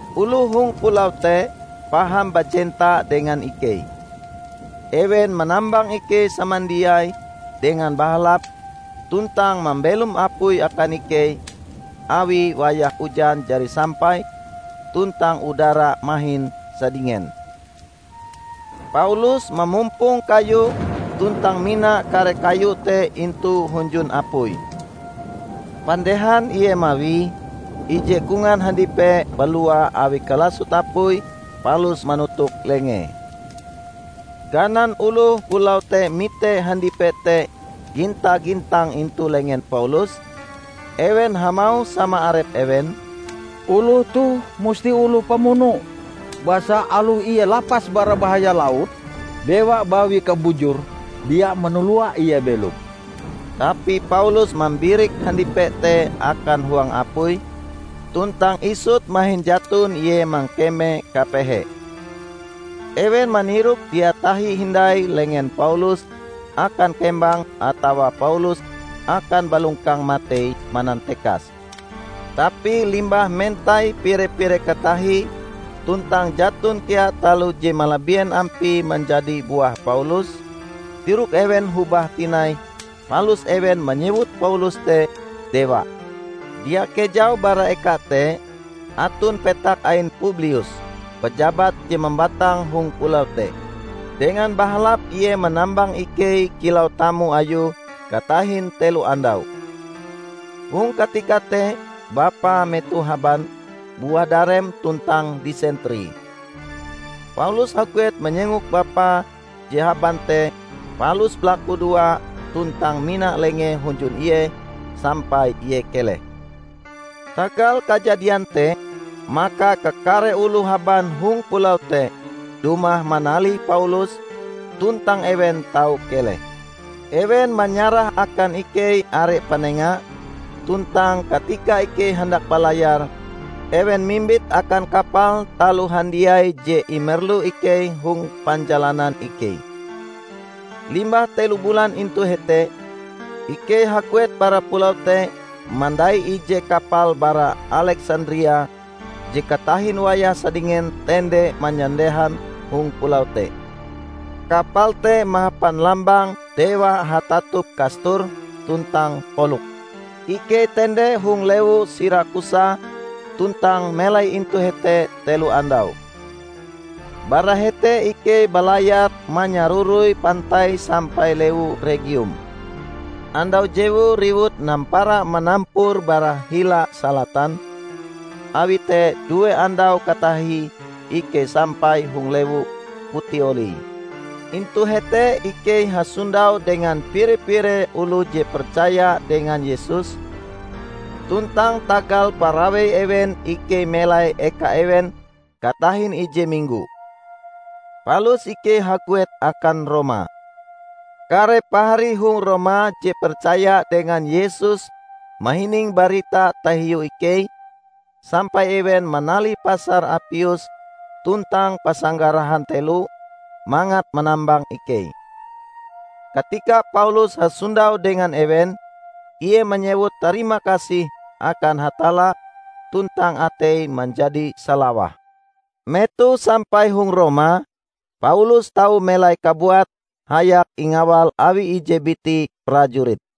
Oloh hong pulau te paham bajenta dengan ikei. Ewen manambang ikei samandiai dengan bahalap tuntang mambelom apui akan ikei awi wayah ujan jari sampai tuntang udara mahin sadingen. Paulus mamumpong kayu tuntang mina kare kayu te intu hunjun apui. Pandehan ie mawie, ije kongan handipe balua awi kalasot apui palus manotok lengee. Ganan oloh pulau te mite handipe te ginta-gintang intu lengen Paulus, ewen hamauh sama arep ewen, "Oloh toh musti oloh pamuno, basa aloh ie lapas bara bahaya laut, Dewa Bawi Kabujur dia manalua ie belom." Tapi Paulus mambirik handipe te akan huang apui tuntang isut mahin jaton ie mangkeme kapehe. Ewen manirok dia tahi hindai lengen Paulus akan kembang atawa Paulus akan balongkang matei manantekas. Tapi limbah mentai pire-pire katahie tuntang jaton kea taloh je malabien ampie manjadi buah Paulus, tirok ewen hobah tinai palus ewen manyewut Paulus te Dewa. Dia kejau bara eka te aton petak ain Publius, pejabat je mambatang hong pulau te. Dengan bahalap ie manambang ikei kilau tamu ayue katahin telo andau. Hong katika te bapae metoh haban, buah darem tuntang disentri. Paulus haguet manyengok bapae je haban te palus balakudoa tuntang mina lengee hunjun ie sampai ie keleh. Tagal kajadian te maka kakare oloh haban hong pulau te dumah manalih Paulus, tuntang ewen tau keleh. Ewen manyarah akan ikei are panenga, tuntang katika ikei handak balayar, ewen mimbit akan kapal taloh handiai je imerlu ikei hong panjalanan ikei. Limbah telo bulan intu hete, ikei haguet bara pulau te mandai ije kapal bara Aleksandria je katahin wayah sadingen tende manyandehan hong pulau te. Kapal te mahapan lambang "Dewa Hatatup Kastor tuntang Poluks". Ikei tende hong lewu Sirakusa tuntang melai intu hete telo andau. Bara hete ikei balayar manyaroroi pantai sampai lewu Regium. Andau jewue riwut nampara manampur bara hila salatan, awi te due andau katahie ikei sampai hong lewu Putioli. Intu hete ikei hasondau dengan pire-pire oloh je percaya dengan Yesus, tuntang tagal parawei ewen ikei melai eka ewen katahin ije minggo. Palus ikei haguet akan Roma. Kare pahari hong Roma je percaya dengan Yesus mahining barita tahiu ikei, sampai ewen manalih Pasar Apius tuntang Pasanggarahan Telo mangat manambang ikei. Katika Paulus hasondau dengan ewen, ie manyewut tarima kasih akan Hatalla tuntang ateie manjadi salawah. Metoh sampai hong Roma, Paulus tau melai kabuate hayak ingawal awi ije biti prajurit.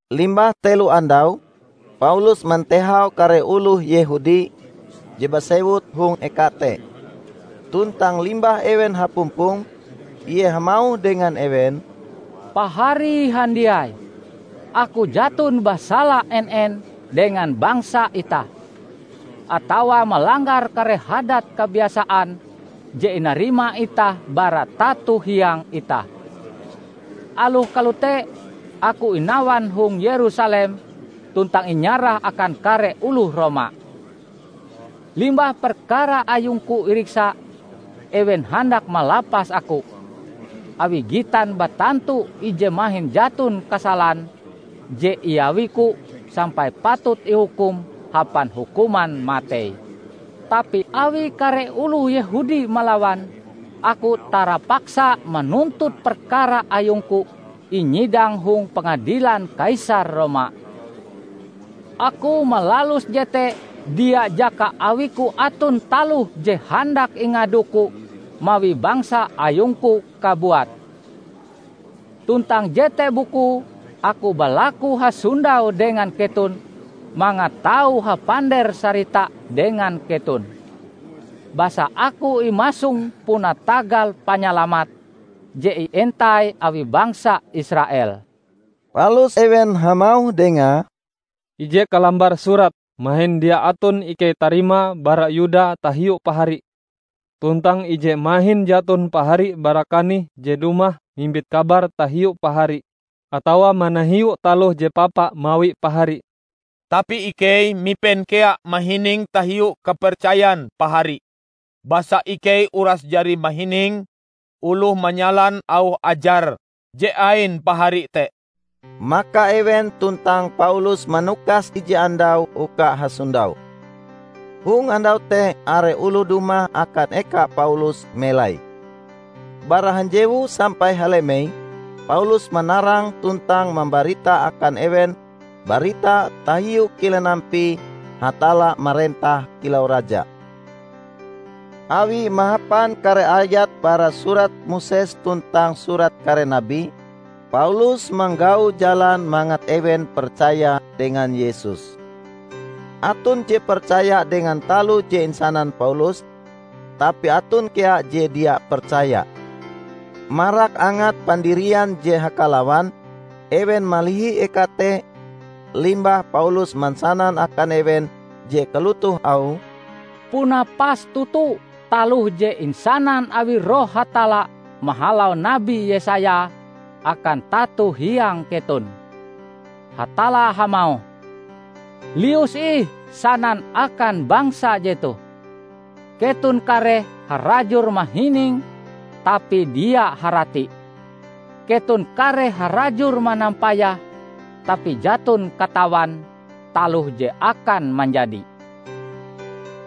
Limbah telo andau, Paulus mantehau kare oloh Yehudi je basewut hong eka te. Tuntang limbah ewen hapumpong, ie hamauh dengan ewen, "Pahari handiai! Aku jaton basala en-en dengan bangsa itah, atawa malanggar kare hadat kabiasaan je inarima itah bara tato hiang itah. Aloh kalote aku inawan hong Yerusalem tuntang inyarah akan kare oloh Roma. Limbah perkara ayungku iriksa, ewen handak malapas aku, awi gitan batantu ije mahin jaton kasalan je iawiku sampai patut ihukum hapan hukuman matei. Tapi awi kare oloh Yehudi malawan, aku tarapaksa manuntut perkara ayungku inyidang hong pangadilan Kaisar Roma. Aku malalus jete dia jaka awiku aton taloh je handak ingaduku mawi bangsa ayungku kabuat. Tuntang jete bukue aku balaku hasondau dengan keton mangat tau hapander-sarita dengan keton; basa aku imasong puna tagal Panyalamat je ientai awi bangsa Israel." Palus ewen hamauh dengae, "Ije kalambar surat mahin dia aton ikei tarimae bara Yuda tahiu pahari. Tuntang ije mahin jaton pahari bara kanih je dumah mimbit kabar tahiu pahari atawa manahiu taloh je papa mawi pahari. Tapi ikei mipen kea mahining tahiu kapercayan pahari, basa ikei uras jari mahining oloh manyalan auh ajar je ain pahari te." Maka ewen tuntang Paulus manukas ije andau uka hasondau. Hong andau te are oloh dumah akan eka Paulus melai. Bara hanjewu sampai halemei Paulus manarang tuntang mambarita akan ewen barita tahiu kilen ampie Hatalla marentah kilau raja. Awie mahapan kare ayat bara surat Moses tuntang Surat Kare Nabi, Paulus manggau jalan mangat ewen percaya dengan Yesus. Aton je percaya dengan taloh je insanan Paulus, tapi aton kea je dia percaya. Marak angat pandirian je hakalawan, ewen malihi eka te, limbah Paulus mansanan akan ewen je kalotoh auhe, "Puna pas toto taloh je insanan awi Roh Hatalla mahalau Nabi Yesaya akan tato hiang keton! Hatalla hamauh, 'Lius ih sanan akan bangsa jetoh: keton kareh harajur mahining tapi dia harati; keton kareh harajur manampayah tapi jaton katawan taloh je akan manjadi.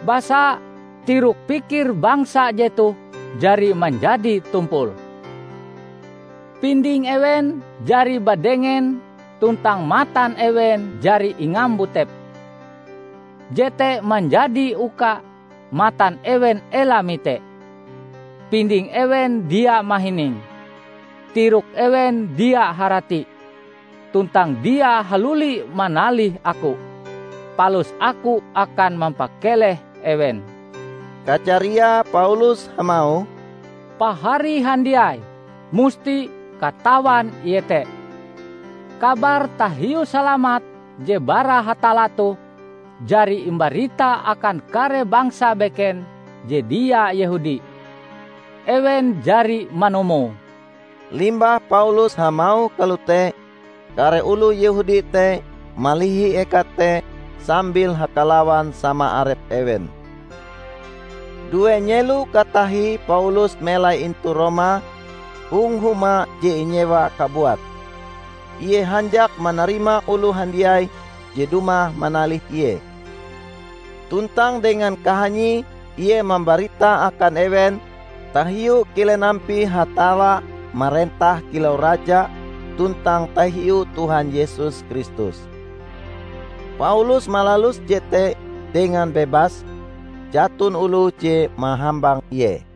Basa tirok pikir bangsa jetoh jari manjadi tumpul. pinding ewen jari badengen tuntang matan ewen jari ingambutepe. Jete manjadi uka matan ewen ela mite, pinding ewen dia mahining, tirok ewen dia harati, tuntang dia haluli manalih Aku, palus Aku akan mampakeleh ewen.' " Kajariae Paulus hamauh, "Pahari handiai musti katawan iete, kabar tahiu salamat je bara Hatalla toh jari imbarita akan kare bangsa beken je dia Yehudi. Ewen jari manumuoe!" [ Limbah Paulus hamauh kalote, kare oloh Yehudi te malihi eka te sambil hakalawan sama arep ewen.] Due nyelo katahie Paulus melai intu Roma, hong huma je inyewae kabuat. Ie hanjak manarima oloh handiai je dumah manalih ie. Tuntang dengan kahanyie ie mambarita akan ewen tahiu kilen ampie Hatalla marentah kilau Raja tuntang tahiu Tuhan Yesus Kristus. Paulus malalus jete dengan bebas, jaton oloh je mahambang ie.